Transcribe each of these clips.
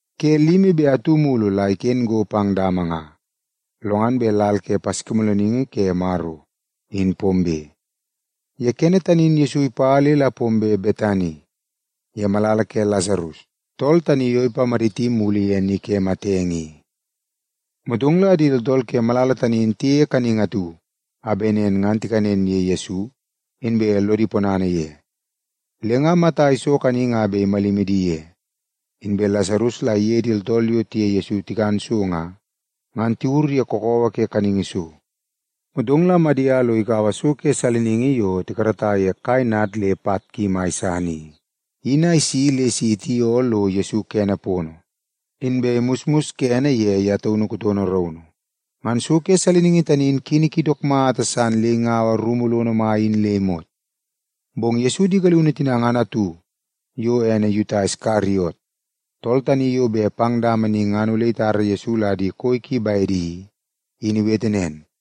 Ke limi be atu mulu la iken go pang dama nga, lo ngan bet lal ke Paskimoolooningi Ke Maro, in pombe. Ye kene tani in Yesu ipa le la pombe Betani, ye malala ke Lasarus, tool tani yo ipamaditi mulu ye ni ke matenge i. Motong la di tooltool ke malala tani in tiyeie kanningi atu a bet nen ngan tikanen ye Yesu, inbe lodi ponana ye. Le nga Mata iso kaningi a bet imalimi di ye, inbe Lasarus la iye di tooltool yo tiye Yesu tikan so nga, ngan tiwur ye kakawa ke kaningi so. Motong la Madia lo ikaua so ke saliningi yo tikarata ye kai nad le pat ki mai san i, in a isi le si itioo lo Yesu kene pono, inbe imusmus kene ye ye taunu kutono raunu. Ngan so ke saliningi tani in kini ki dook mata san le ingaua rumu lono mai in le imot. Bong Yesu di galiunu tina ngan atu, yo ene Yuta Iskariot, tool tani yo bet pang dama ni ngan ole itara Yesu la di koi ki bedi i, in iwete nen,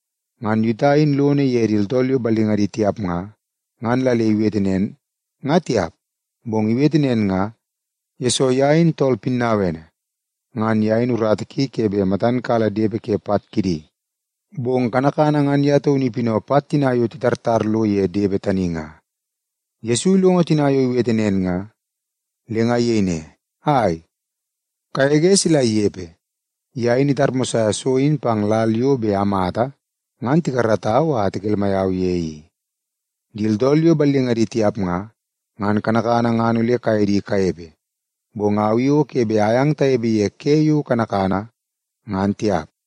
Ngan Yuta tani in lono ye di tooltool yo ballingadi tiap nga, ngan la le iwete nen, ngan tiap. Bong iwete nen nga, yesoo ye in tool pinnauene. Ngan ye in urata ki ke bet matan kala depe ke pat kidi, bong kanakana ngan ye taunu ipinau pat tina yo titartar lo ye depe tani nga. Yesu ilongo tina yo iwete nen nga, le nga iyei ne, “Ai, kagege sila inepe! Ye in itarmosaia so in pang lal yo bet amata ngan tikaratau a tikelmai au ye i. Di tooltool yo ballingadi tiap nga, ngan kanakana ngan ole kaye di kanepe, bong au i o ke bet ayang tanepe ye ke yo kanakana, ngan tiap.”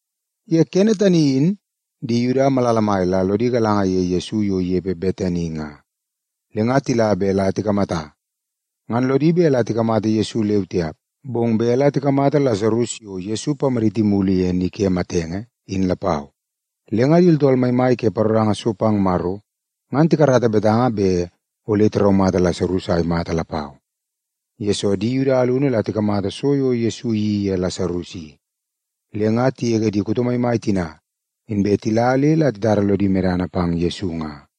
Ye kene tani in, di Yuda malala mai la lodi galanga ye Yesu yo inepe Betani nga, le nga tila bet la tikamata. Ngan lodi bet la tikamata Yesu leu tiap, bong bet la tikamata Lasarus yo Yesu ipamaditi mulu ye ni ke matenge, in lapau. Le nga di tooltool maimai ke paroranga so pang Maro ngan tikarata betanga bet ole tiraumata Lasarus a imata lapau. Yesoo, di Yuda alunu la tikamata so yo Yesu iyeii ye Lasarus i, le nga tigege di kuto maimai tina, inbe tila le la titara lodi medana pang Yesu nga.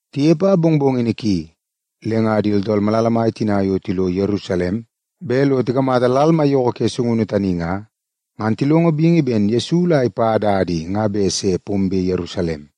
Tinepe a mongmongini ki, le nga di tooltool malala mai tina yo tilo Yerusalem bet lo tikamata lal maiyoko ke sungunu tani nga, ngan tilongo bingi ben Yesu la ipa dada i nga bet se pombe Yerusalem.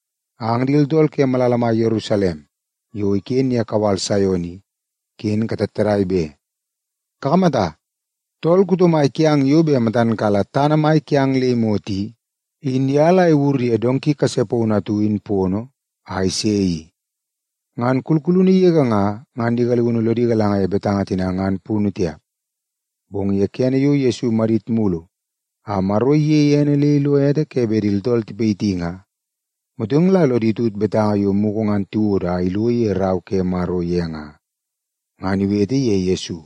“Ang di tooltool ke malala mai Yerusalem yo iken ye kawal Saion i, ken katattadai be! Kakamata, tool kuto mai kiang yo bet matan kala tana mai kiang le imot i, in ye la iwur ye donki kase paunu atu in pono, a ise i.” Ngan kulkulunu yege nga, ngan di galiunu lodi galanga ye betanga tina ngan punu tiap. Bong ye kene yo Yesu imadit mulu a Maro iyeie ene le ilo ete ke bet di tooltool tipayiti nga, motong la lodi tut betanga yo mugu ngan tiwodo a ilo ye Rau ke Maro ye nga, ngan iwete ye Yesu.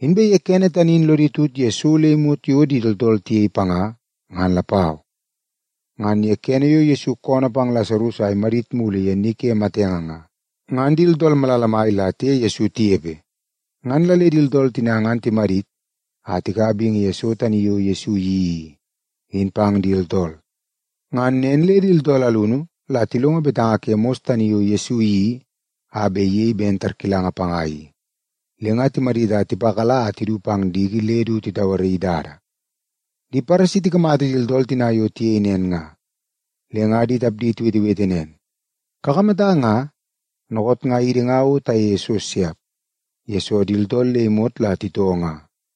Inbe ye kene tani in lodi tut ye so le imot yo di tooltool tiyei panga ngan lapau. Ngan ye kene yo Yesu koonoo pang Lasarus a imadit mulu ye ni ke matenge nga, ngan di tooltool malala mai la tiye Yesu tinepe nga. Ngan la le di tooltool tina ngan timadit a tikaua bingi ye so tani yo Yesu iyeii i, in pang di tooltool. Ngan nen le di tooltool alunu la tilongo betanga ke mos tani yo Yesu iyeii a bet iyei ben tarkilanga panga i, le nga timadit a tipakala a tidu pang diki le du titauaraii dada. Di Paresi tikamata di tooltool tina yo tiyei nen nga, le nga di tapdi tiwetewete nen, “Kakamata nga, dookoot nga idi nga o tayeie so siap, yesoo di tooltool le imot la titoo nga.”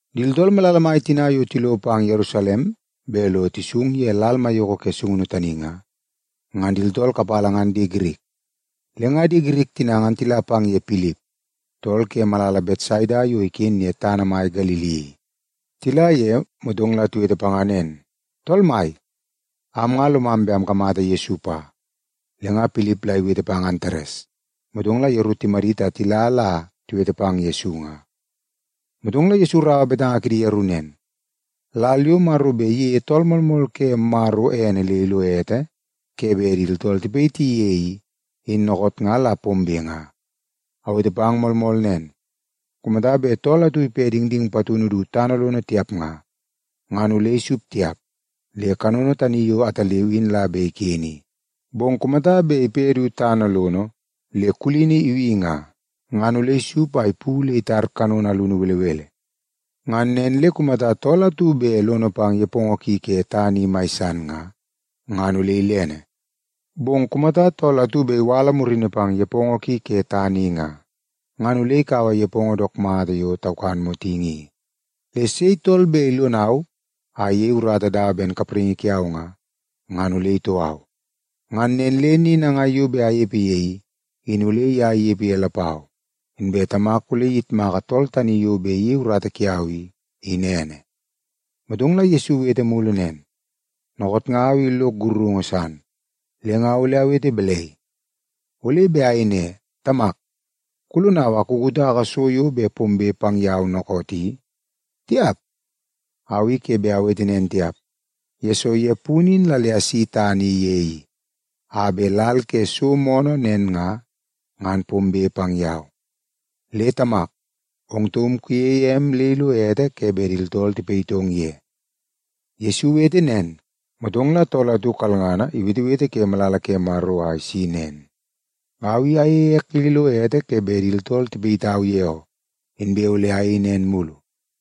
Di tooltool malala mai tina yo tilo pang Yerusalem bet lo tisung ye lal maiyoko ke sungunu tani nga, ngan di tooltool kapala ngan di Girik. Le nga di Girik tina ngan tila pang ye Pilip, tool ke malala Betsaida yo iken ye tana mai Galili i. Tila ye, motong la tiwete panga nen, “Tool mai, am nga lomam bet amkamata Yesu pa.” Le nga Pilip la iwete pang Antares, motong la yeru timadit a tila la tiwete pang Yesu nga. Motong la Yesu iraua betanga kidi yeru nen, “Lal yo Maro bet iyeie Tool Moolmool ke Maro ene le ilo ete ke bet di tooltool tipayiti ye i, in dookoot nga la pombe nga. Awete pang moolmool nen, kumata bet tool atu ipe dingding patunu du tana lono tiap nga, ngan ole isup tiap le kanono tani yo ataleu in la bet iken i. Bong kumata bet ipe du tana lono le kulini ibi nga, ngan ole isup a ipu le itar kanono alunu belebele. Ngan nen le kumata tool atu bet lono pang nepongo ki ke tana i mai san nga, ngan ole ilene. Bong kumata tool atu bet iwala murini pang nepongo ki ke tana i nga, ngan ole ikaua nepongo dook mata yo taukan motingi i. Le kumata sei tool bet ilonau a iyei urata dawa ben kapraingi kiau nga, ngan ole itoo au. Ngan nen le ni nangai yo bet anepe ye i, in ole ye inepe ye lapau. Inbe Tamak ole iyitmaka tool tani yo bet iyei urata kiau i, in ene.” Motong la Yesu iwete mulu nen, “Dookoot nga au i lok sakarungu san, le nga ole awete balai? Ole bet ayei ne, ‘Tamak, kulonau a kukutaka so yo bet pombe pang yau dookoot i’? Tiap! Au i ke bet awete nen tiap, yesoo ye punu in la le asi tana ye i, a bet lal ke so moonoo nen nga, ngan pombe pang yau. Le Tamak, ong taum kuyeie em le ilo ete ke bet di tooltool tipayitong ye!” Yesu iwete nen, motong la tool atu kalngana iwetewete ke malala ke Maro a isi nen, “Au i ayeie ek le ilo ete ke bet di tooltool tipayitau ye oo, inbe ole ayei nen mulu.”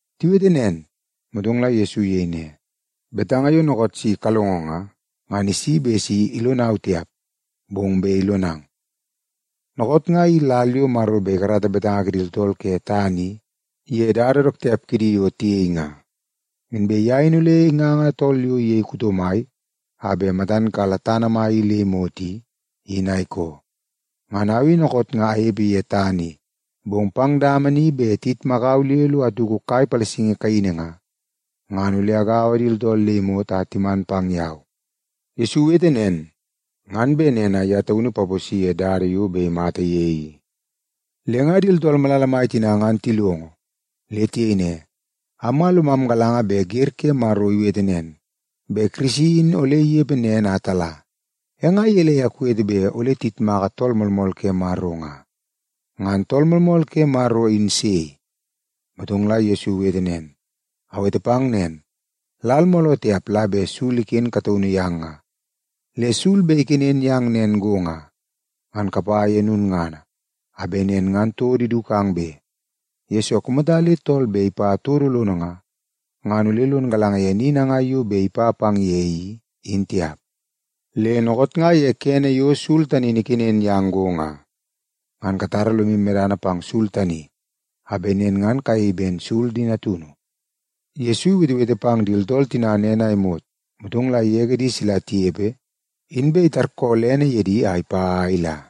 Tiwete nen, motong la Yesu iyei ne, “Betanga yo dookoot si kalongo nga, ngan isi bet si ilonau tiap, bong bet ilonang. Dookoot nga i lal yo Maro bet ikarata betanga kidi tooltool ke tana i ye dada dook tiap kidi yo tiyei nga. Inbe ye in ole inganga tool yo iyei kuto mai a bet matan kala tana mai i le imot i, in a ikoo. Ngan au i dookoot nga anepe ye tana i, bong pang dama ni bet tiyitmakau le lo atuku kai palasingi kaini nga, ngan ole agaua di tooltool le imot a timan pang yau.” Yesu iwete nen ngan bet nen a ye taunu ipaposi ye dada yo bet imata ye i. Le nga di tooltool malala mai tina ngan tilongo, le tiyei ne, “Am nga lomam galanga bet wer ke Maro iwete nen, bet Kirisi in ole inepe nen a tala. E nga gelei a kuwete bet ole tiyitmaka Tool Moolmool ke Maro nga? Ngan Tool Moolmool ke Maro in sei?” Motong la Yesu iwete nen, “Awete pang nen, lal mooloo tiap la bet sul iken kataunu yang nga. Le sul bet ikenen yang nen go nga, ngan kapa ye lulngana, a bet nen ngan todo idukang be. Yesoo, kumata le tool bet ipa todo lono nga, ngan ole lon galanga ye ni nangai yo bet ipa pang ye i, in tiap. Le dookoot nga ye kene yo sul tani in ikenen yang go nga, ngan katara lomu medana pang sul tani a bet nen ngan kayei ben sul di natunu.” Yesu iwetewete pang di tooltool tina nen a imot, motong la igege di sila tinepe, inbe itarkoolene ye di a ipa a ila.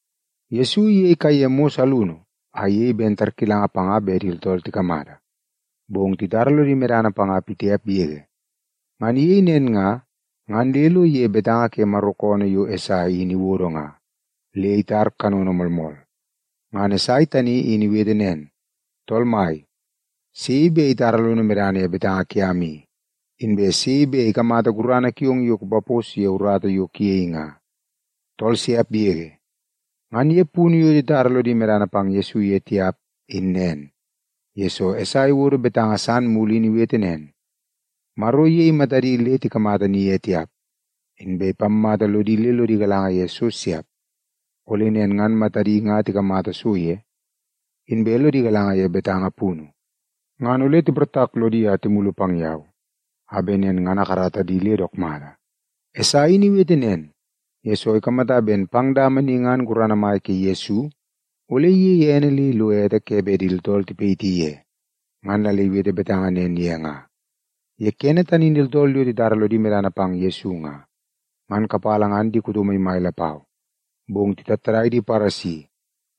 Yesu iyei kaiye mos alunu a iyei ben tarkilanga panga bet di tooltool tikamata, bong titara lodi medana panga pitiap yege. Ngan iyei nen nga, ngan le lo iyei betanga ke Maro koonoo yo Esai in iwodo nga, le itar kanono moolmool. Ngan Esai tani in iwete nen, “Tool Mai, sei bet itara lono medana ye betanga kiam i, inbe sei bet ikamata gurana kiong yo kupapos ye urata yo kuyei nga? Tool siap yege.” Ngan ye punu yo titara lodi medana pang Yesu ye tiap in nen, yesoo Esai iwodo betanga san mulu in iwete nen, “Maro iyei matadi le tikamata ni tiap, inbe ipammata lodi le lodi galanga ye so siap. Ole nen ngan matadi nga tikamata so ye, inbe lodi galanga ye betanga punu, ngan ole tiportak lodi a timulu pang yau a bet nen ngan akarata di le dook mata.” Esai in iwete nen, yesoo ikamata bet pang dama ni ngan gurana mai ke Yesu ole iyeie ene le ilo ete ke bet di tooltool tipayiti ye, ngan la le iwete betanga nen ye nga. Ye kene tani in di tooltool yo titara lodi medana pang Yesu nga, ngan kapala ngan di kuto maimai lapau. Bong titattadai di Paresi,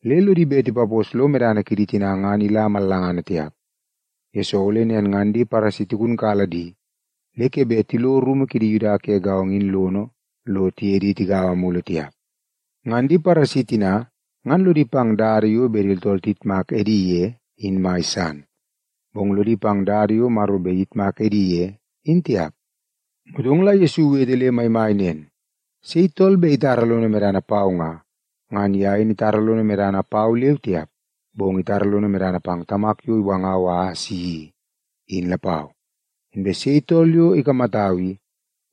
le lodi bet tipapos lo medana kidi tina ngan ila mallangana tiap, yesoo ole nen ngan di Paresi tigunkala di le ke bet tilo rumu kidi Yuda ke gaongo in lono lo tiye di tigaua mulu tiap. Ngan di Paresi tina ngan lodi pang dada yo bet di tooltool tiyitmak edi ye, in mai san, bong lodi pang dada yo Maro bet iyitmak edi ye, in tiap. Motong la Yesu iwete le maimai nen, “Sei tool bet itara lono medana pau nga, ngan ye in itara lono medana pau leu tiap, bong itara lono medana pang Tamak yo iwangau a asi i, in lapau. Inbe sei tool yo ikamatau i,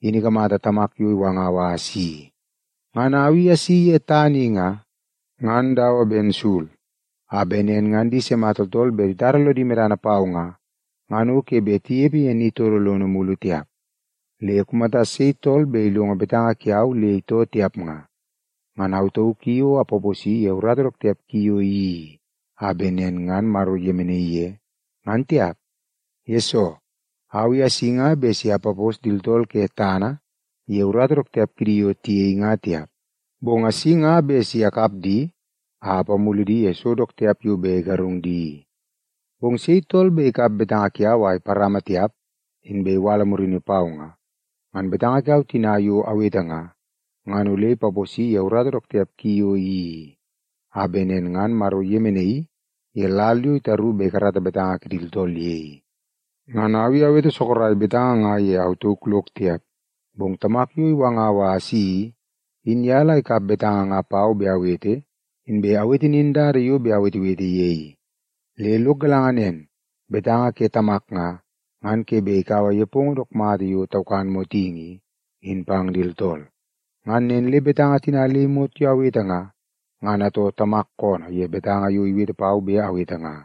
in ikamata Tamak yo iwangau a asi i. Ngan au i asi ye tana i nga, ngan dawa ben sul, a bet nen ngan di sima tooltool bet titara lodi medana pau nga, ngan o ke bet tinepe ye ni todo lono mulu tiap. Le kumata sei bet ilongo betanga kiau le itoo tiap nga, ngan au tauk i o ke bet apaposi ye urata dook tiap ki yo iyeii i, a bet nen ngan Maro iyemenaii ye, ngan tiap. Yesoo, au i asi nga bet si apapos di tooltool ke tana i ye urata dook tiap kidi yo tiyei nga tiap, bong asi nga bet si akap di a apamulu di ye so dook tiap yo bet igarung di i. Bong sei tool bet ikap betanga kiau a iparama tiap, inbe iwala murini pau nga, ngan betanga kiau tina yo awete nga, ngan ole ipaposi ye urata dook tiap ki yo iyeii i, a bet nen ngan Maro iyemenai ye lal yo itaru bet ikarata betanga kidi tooltool ye i. Ngan au i awete sorok betanga nga ye au tauk lok tiap, bong Tamak yo iwangau a asi i, in ye la ikap betanga nga pau bet awete, inbe iwete nin dada yo bet awetewete ye i. Le lok galanga nen, betanga ke Tamak nga, ngan ke bet ikaua nepongo dook mata yo taukan motingi i, in pang di tooltool. Ngan nen le betanga tina le imot yo awete nga, ngan atoo Tamak koonoo ye betanga yo iwete pau bet awete nga.”